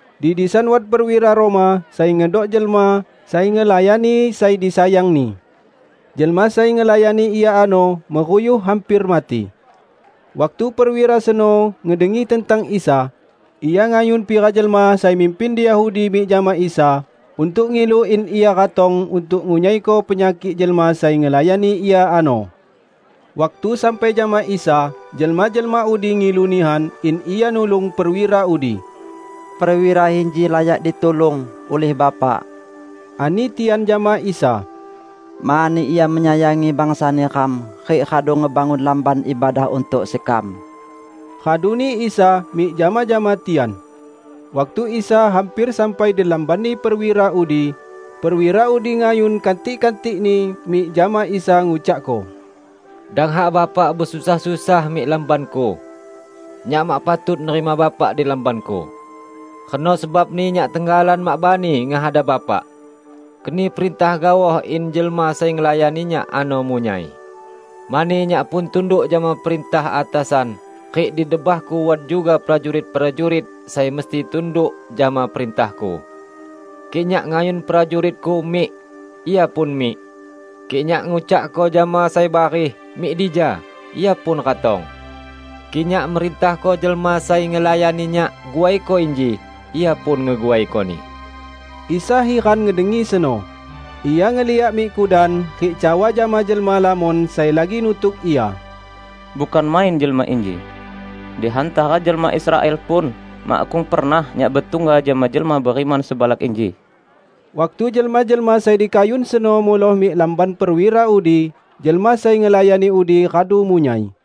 Di disan wat perwira Roma sai ngedok jelma sai ngelayani sai disayangni. Jelma sai ngelayani ia ano meruyuh hamper mati. Waktu perwira seno ngedengi tentang Isa, ia ngayun pira jelma sai mimpin di Yahudi mik jama Isa untuk ngilu in Ia ratong untuk ngunyaiko penyakik jelma sai ngelayani ia ano. Waktu sampai jama Isa, jelma-jelma udi ngilu nihan in Ia nulung perwira udi. "Perwira inji layak ditulung, ulih Bapak," ani tian jama Isa, "mani ia menyayangi bangsa neram rik radu ngebangun lamban ibadah untuk sekam." Raduni Isa mik jama-jama tian. Waktu Isa hamper sampai di lambanni perwira udi, perwira udi ngayun kantik-kantikni mik jama Isa ngucakko, "Dang hak bapak besusah-susah mik lambanku. Nyak mak patut nerima Bapak di lambanku. Reno sebabni nyak tenggalan mak bani ngehadap Bapak. Keni perintah gaoh in jelma sai ngelayani nyak ano munyai. Mani nyak pun tunduk jama perintah atasan rik di debahku wat juga prajurit-prajurit sai mesti tunduk jama perintahku. Kik nyak ngayun prajuritku, 'Mik!' ia pun mik; kik nyak ngucakko jama sai bareh, 'Mik dija!' ia pun ratong. Kik nyak merintahko jelma sai ngelayani nyak, 'Guaiko inji!' ia pun ngeguaikoni." Isa hiran ngedengi seno. Ia ngeliak mik kudan rik cawa jama jelma lamon sai lagi nutuk Ia, "Bukan main jelma inji. Di hantara jelma Israel pun makkung pernah Nyak betungga jama jelma beriman sebalak inji!" Waktu jelma-jelma sai dikayun seno muloh mik lamban perwira udi, jelma sai ngelayani udi radu munyai.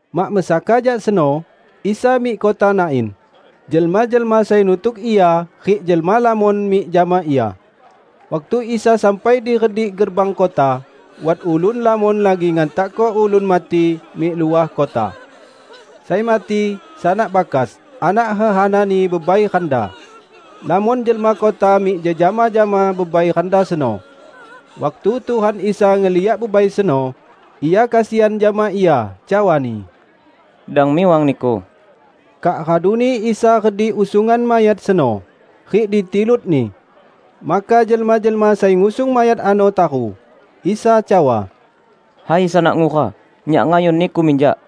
Mak mesaka jak seno, Isa mik kota Nain. Jelma-jelma sai nutuk Ia rik jelma lamon mik jama Ia. Waktu Isa sampai di redik gerbang kota, wat ulun lamon lagi ngantakko ulun mati mik luah kota. Sai mati, sanak bakas, anak hehanani bebai randa. Lamon jelma kota mik jejama jama bebai randa seno. Waktu Tuhan Isa ngeliak bebai seno, Ia kesian jama ia cawa-Ni, "Dang miwang niku!" Kak raduni Isa redik usungan mayat seno, rik ditilutni. Maka jelma-jelma sai ngusung mayat ano taru. Isa cawa, "Hai sanak ngura, Nyak ngayun niku minjak!"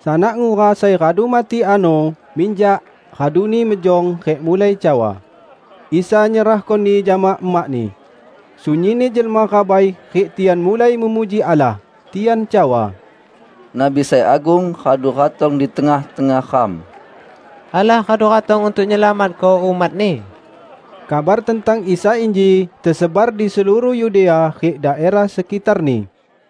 Sanak ngura sai radu mati ano, minjak raduni, mejong rik mulai cawa. Isa nyerahkoni jama emakni. Sunyinni jelma rabai rik tian mulai memuji Allah. Tian cawa, "Nabi sai agung radu ratong di tengah-tengah ram! Allah radu ratong untuk nyelamatko umat-Ni!" Kabar tentang Isa inji tesebar di seluruh Yudea rik daerah sekitarni.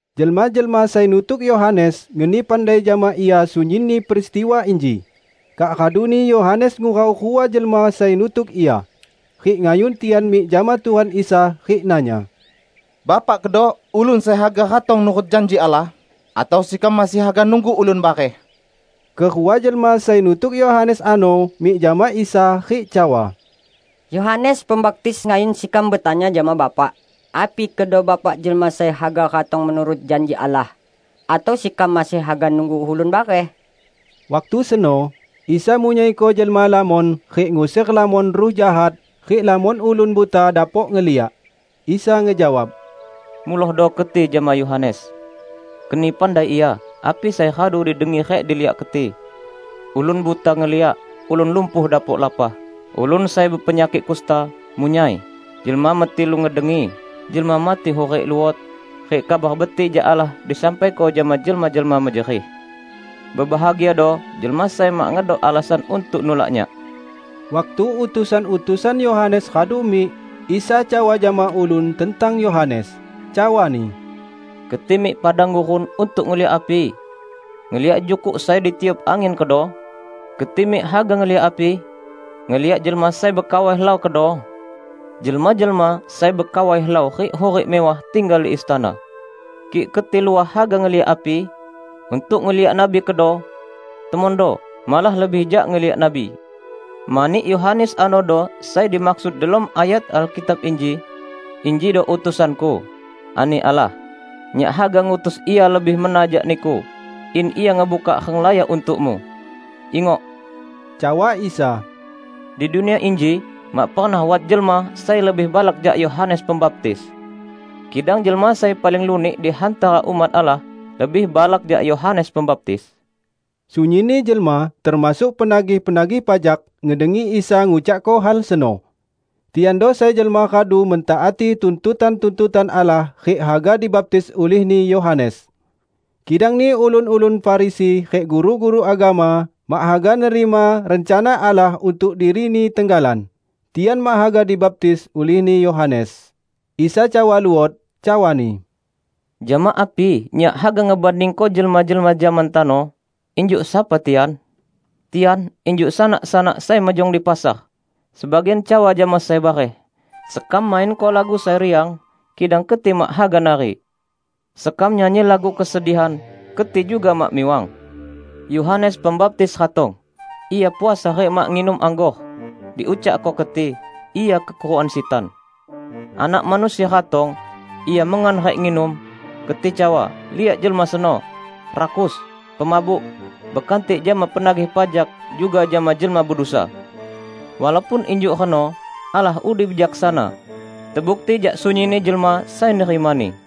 Jelma-jelma sai nutuk Yohanes ngeni pandai jama ia sunyinni peristiwa inji. Kak raduni Yohanes ngurau rua jelma sai nutuk ia. Rik ngayun tian mik jama Tuhan Isa rik nanya, "Bapak kedo, ulun sai haga ratong nurut janji Allah, atau sekam masih haga nunggu ulun bareh?" Kerua jelma sai nutuk Yohanes ano mik jama Isa rik cawa, "Yohanes Pembaptis ngayun sekam betanya jama Bapak, api kedo Bapak jelma sai haga ratong menurut janji Allah, atau sekam masih haga nunggu ulun bareh?" Waktu seno, Isa munyaiko jelma lamon rik nguser lamon ruh jahat rik lamon ulun buta dapok ngeliak. Isa ngejawab, "Mulohdo keti jama Yohanes, keni pandai ia api sai radu didengi rik diliak keti: ulun buta ngeliak, ulun lumpuh dapok lapah, ulun sai bepenyakik kusta, munyai, jelma metilu ngedengi, jelma mati hurik luot, rik Kabar Betik jak Allah disampaiko jama jelma-jelma mejerih. Bebahagiado jelma sai mak ngedok alasan untuk nulak Nyak." Waktu utusan-utusan Yohanes radu mik, Isa cawa jama ulun tentang Yohanes, cawa-Ni, "Keti mik padang gurun untuk ngeliak api? Ngeliak jukuk sai ditiup angin kedo? Keti mik haga ngeliak api? Ngeliak jelma sai bekawai helau kedo? Jelma-jelma sai bekawai helau rik hurik mewah tinggal di istana! Kik keti luah haga ngeliak api? Untuk ngeliak nabi kedo? Temondo, malah lebih jak ngeliak nabi. Mani Yohanes anodo sai dimaksud delom ayat Alkitab inji, 'Injido utusan-Ku,' ani Allah, 'Nyak haga ngutus ia lebih mena jak Niku, in ia ngebuka renglaya untuk-Mu!' " "Ingok," cawa Isa, "di dunia inji mak pernah wat jelma sai lebih balak jak Yohanes Pembaptis. Kidang jelma sai paling lunik di hantara umat Allah, lebih balak jak Yohanes Pembaptis." Sunyinni jelma -- termasuk penagih-penagih pajak -- ngedengi Isa ngucakko hal seno; tiando sai jelma radu mentaati tuntutan-tuntutan Allah rik haga dibaptis ulihni Yohanes. Kidangni ulun-ulun Farisi rik guru-guru agama mak haga nerima rencana Allah untuk dirini tenggalan. Tian mak haga dibaptis ulihni Yohanes. Isa cawa luot, cawa-Ni, "Jama api Nyak haga ngebandingko jelma-jelma zaman tano? Injuk sapa tian? Tian injuk sanak-sanak sai mejong di pasar; sebagian cawa jama sai bareh, 'Sekam mainko lagu sai riang, kidang keti mak haga nari! Sekam nyanyi lagu kesedihan, keti juga mak miwang!' Yohanes Pembaptis ratong -- ia puasa rik mak nginum anggor -- diucakko keti, 'Ia kekurukan sitan!' Anak Manusia ratong -- Ia mengan rik nginum -- keti cawa, 'Liak jelma seno! Rakus, pemabuk, bekantik jama penagih pajak juga jama jelma bedusa.' Walaupun injuk reno, Allah udi bijaksana, tebukti jak sunyinni jelma sai nerima-Ni."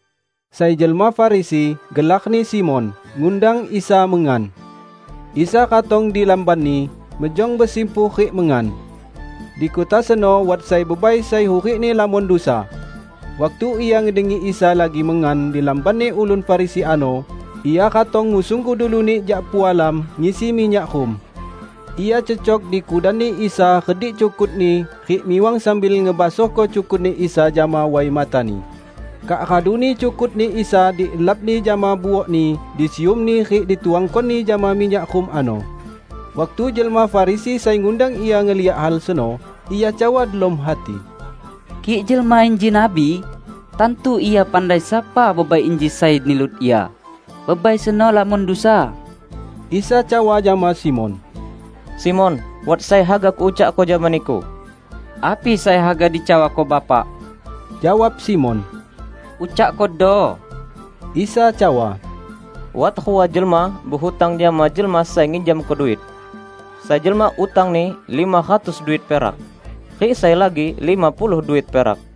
Sai jelma Farisi, gelarni Simon, ngundang Isa mengan. Isa ratong di lambanni, mejong besimpuh rik mengan. Di kota seno wat sai bebai sai hurikni lamon dusa. Waktu ia ngedengi Isa lagi mengan di lambanni ulun Farisi ano, ia ratong ngusung gudu lunik jak pualam ngisi minyak rum. Ia cecok di kudanni Isa redik cukut-Ni rik miwang sambil ngebasohko cukutni Isa jama way matani. Kak raduni cukutni Isa dilapni jama buokni, disiumni rik dituangkoni jama minyak rum ano. Waktu jelma Farisi sai ngundang Ia ngeliak hal seno, ia cawa delom hati, "Kik jelma inji nabi, tantu Ia pandai sapa bebai inji sai nilut Ia, bebai seno lamon dusa!" Isa cawa jama Simon, "Simon, wat sai haga Kucawako jama niku." "Api sai haga dicawako Bapak," jawab Simon, "ucakkodo." Isa cawa, "Wat rua jelma behutang jama jelma sai nginjamko duit. Sai jelma utangni lima ratus duit perak, rik sai lagi lima puluh duit perak.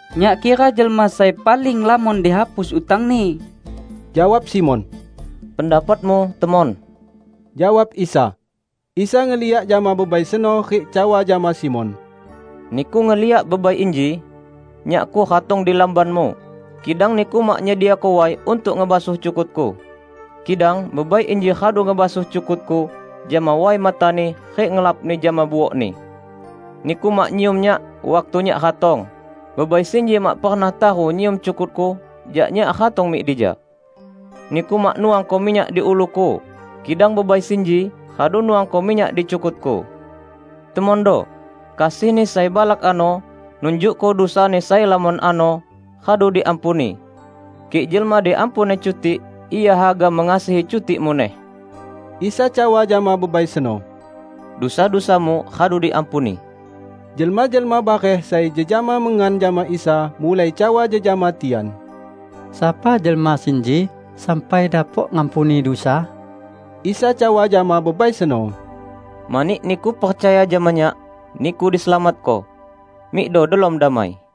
"Nyak kira jelma sai paling lamon dihapus utangni!" jawab Simon. "Pendapatmu temon," jawab Isa. Isa ngeliak jama bebai seno rik cawa jama Simon, "Niku ngeliak bebai inji? Nyakku ratong di lambanmu, kidang niku mak nyediako way untuk ngebasuh cukut-Ku; kidang bebai inji radu ngebasuh cukut-Ku jama way matani rik ngelapni jama buokni. Niku mak nyium Nyak waktu Nyak ratong, bebai sinji mak pernah taru nyium cukut-Ku jak Nyak ratong mik dija. Niku mak nuangko minyak di ulu-Ku, kidang bebai sinji radu nuangko minyak di cukut-Ku. Temondo: kasihni sai balak ano nunjukko dusani sai lamon ano radu diampuni! Kik jelma diampuni cutik, ia haga mengasihi cutik muneh." Isa cawa jama bebai seno, "Dusa-dusamu radu diampuni." Jelma-jelma bareh sai jejama mengan jama Isa mulai cawa jejama tian, "Sapa jelma sinji sampai dapok ngampuni dusa?" Isa cawa jama bebai seno, "Mani niku percaya jama Nyak, niku diselamatko. Mikdo delom damai!"